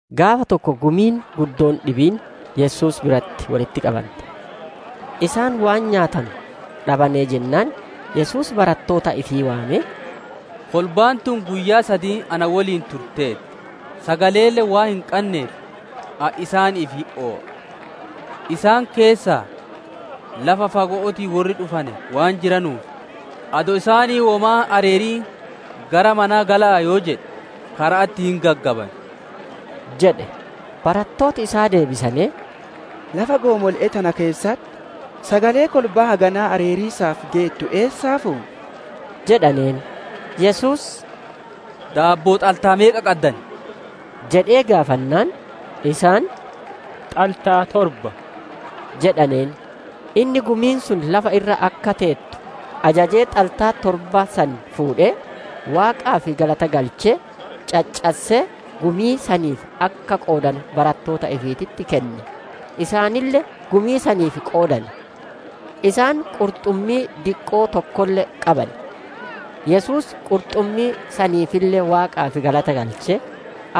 Gaafa tokko gumiin guddoon dhibiin Yesuus biratti wolitti qabante. Isaan waan nyaatanu dhabanee jennaan Yesuus barattoota ifii waamee, «Kolbaan tun guyyaa sadiin na woliin turteerti; sagaleelle waan hin qanneef, ani isaaniif hin naya. Isaan keessaa lafa fago'ootii worri dhufane waan jiranuuf, adoo isaanii womaa hin areerin gara manaa gala'aa yoo jedhe, kara'atti hin gaggaban» jedhe. Barattooti isaa deebisanee, «Lafa goomole'ee tana keessatti sagalee kolbaa haganaa areeriisaaf geettu eessaa fuuna?» jedhaneen. Yesuus, «Daabboo xaltaa meeqa qaddan?» jedhee gaafannaan, isaan, «Xaltaa torba» jedhaneen. Inni gumiin sun lafa irra akka teettu ajajee, xaltaa torba san fuudhee, Waaqaaf galata galchee, caccassee, gumii saniif akka qoodanu barattoota ifiititti kenne; isaanille gumii saniif qoodane. Isaan qurxummii diqqoo tokkolle qaban. Yesuus qurxummii saniifille Waaqaaf galata galchee,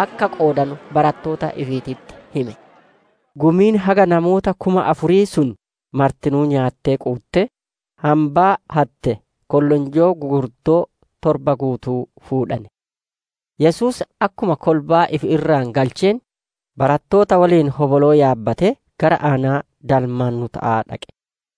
akka qoodanu barattoota ifiititti hime. Gumiin haga namoota kuma afurii sun martinuu nyaattee quuttee, hambaa hatte kollonjoo gugurdoo torba guutuu fuudhane. Yesuus akkuma kolbaa ifi irraa galcheen, barattoota woliin hoboloo yaabbatee gara aanaa Dalmaanuta'aa dhaqe.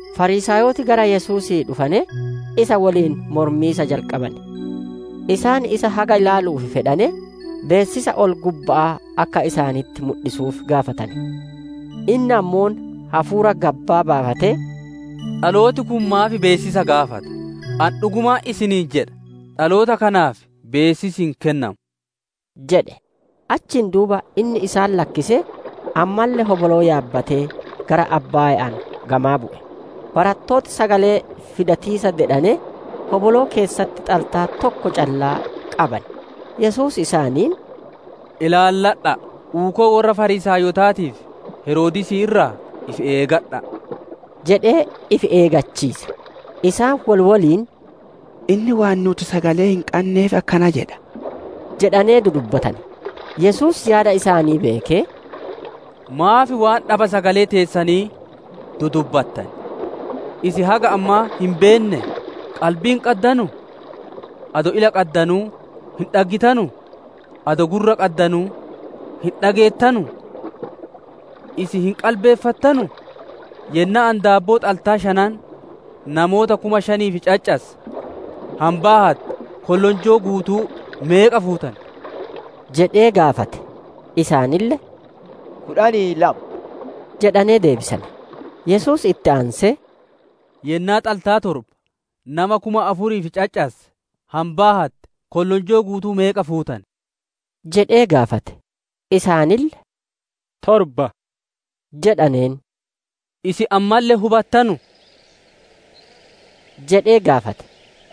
Fariisaayoti gara Yesuusii dhufanee, isa woliin mormiisa jalqabane. Isaan isa haga ilaaluu fedhanee, beessisa ol-gubba'aa akka isaanitti mudhisuuf gaafatane. Inni ammoo hafuura gabbaa baafatee, «Dhalooti kun maaf beessisa gaafata? Ani dhugumaan isiniin jedha, dhaloota kanaaf beessisi hin kennamu!» jedhe. Achiin duuba inni isaan lakkisee, ammalle hoboloo yaabbatee, gara abbaayaan gamaa bu'e. Barattooti sagalee fidatiisa dedhanee, hoboloo keessatti xaltaa tokko callaa qaban. Yesuus isaaniin, «Ilaalladha'a! Uukoo worra Fariisaayotaatii fi Heroodisii irraa ifi eegadha'a!» jedhee ifi eeggachiise. Isaan wol woliin, «Inni waan nuuti sagalee hin qanneef akkana jedha» jedhanee dudubbatane. Yesuus yaada isaanii beekee, «Maaf waan dhaba sagalee teessanii dudubbattan? Isin haga ammaa hin beennee? Qalbii hin qaddanuu? Adoo ila qaddanuu hin dhaggitanuu? Adoo gurra qaddanuu hin dhageettanuu? Isin hin qalbeeffattanuu? Yennaa ani daabboo xaltaa shanan namoota kuma shaniif caccasse, hambaa hatte kollonjoo guutuu meeqa fuutane?» jedhee gaafate. Isaanille, «Kudhanii lama» jedhanee deebisane. Yesuus itti aansee, «Yennaa xaltaa torba nama kuma afuriif caccasse, hambaa hatte kollonjoo guutuu meeqa fuutane?» jedhee gaafate. Isaanille, «Torba» jedhaneen. «Isin ammalle hin hubattanuu?» jedhee gaafate.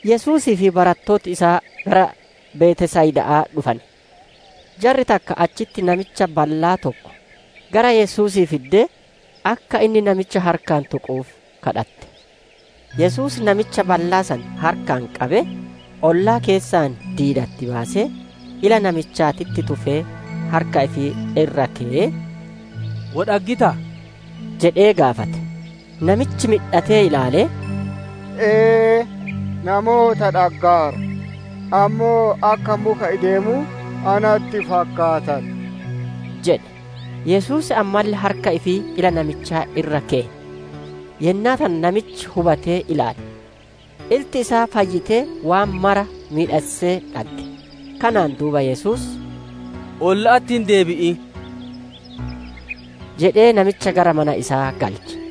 Yesuusii fi barattooti isaa gara Betsayida'aa dhufane. Jarri takka achitti namicha ballaa tokko gara Yesuusii fiddee, akka inni namicha harkaan tuquuf kadhatte. Yesuus namicha ballaa san harkaan qabee, ollaa keessaa diidatti baasee, ila namichaatitti tufee, harka ifii irra keyee, «Wo dhaggitaa?» jedhee gaafate. Namichi midhatee ilaalee, «Ee, namoota dhaggaara; ammoo akka muka ideemuu natti fakkaatan» jedhe. Yesuus ammalle harka ifii ila namichaa irra keye. Yennaa tana namichi hubatee ilaale. Ilti isaa fayyitee waan maraa miidhassee dhagge. Kanaan duuba Yesuus, «Olla'atti hin deebi'in» jedhee namicha gara mana isaa galche.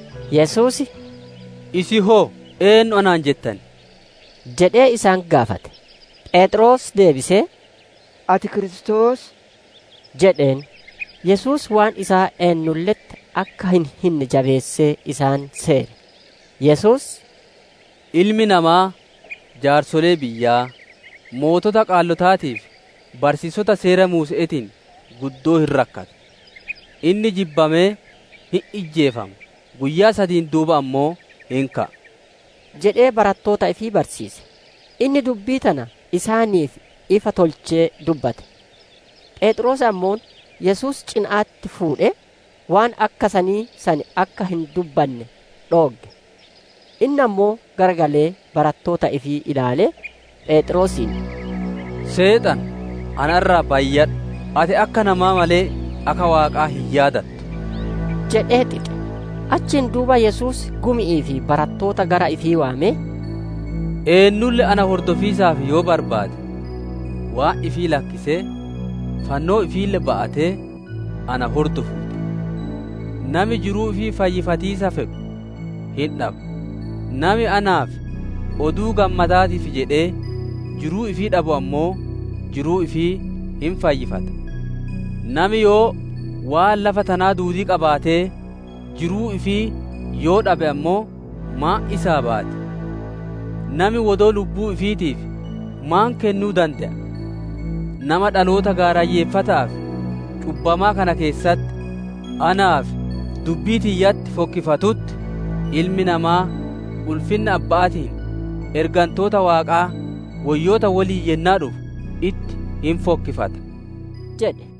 Yesuus, «Isin hoo, eennu anaan jettan?» jedhee isaan gaafate. Pheexroos deebisee, «Ati Kiristoos» jedheen. Yesuus waan isaa eennulle'etti akka hin hinne jabeessee isaan seere. Yesuus, «Ilmi namaa jaarsolee biyyaa, sooreyyii hayyootaatii fi barsiisota Seera Muuse'eetiin guddoo hin rakkata. Inni jibbamee hin ijjeefama; guyyaa sadiin duuba ammoo hin ka'a» jedhee barattoota ifii barsiise. Inni dubbii tana isaaniif ifa tolchee dubbate. Pheexroos ammoo Yesuus cina'atti fuudhee, waan akka sanii san akka hin dubbanne dhoogge. Inni ammoo garagalee barattoota ifii ilaalee, Pheexroosiin, «Seexana, na irraa bayyadhu! Ati akka namaa malee, akka Waaqaa hin yaadattu» jedhee xixe. Achiin duuba Yesuus gumi'ii fi barattoota gara ifii waamee, «Eennulle na hordofiisaaf yoo barbaade, waan ifii lakkisee, fannoo ifiille ba'atee, na hordofuu ti. Nami jiruu ifii fayyifatiisa fedhu hin dhaba; nami anaa fi Oduu Gammadaatiif jedhee jiruu ifii dhabu ammoo, jiruu ifii hin fayyifata. Nami yoo waan lafa tanaa duudii qabaatee, jiruu ifii yoo dhabe ammoo maan isaa baati? Nami wodoo lubbuu ifiitiif maan kennuu dande'a? Nama dhaloota gaarayyeeffata'aa fi cubbamaa kana keessatti, anaa fi dubbii tiyyatti fokkifatutti, Ilmi namaa ulfinna Abbaa ifiitiin, ergantoota Waaqaa woyyoota woliin yennaa dhufu itti hin fokkifata» jedhe.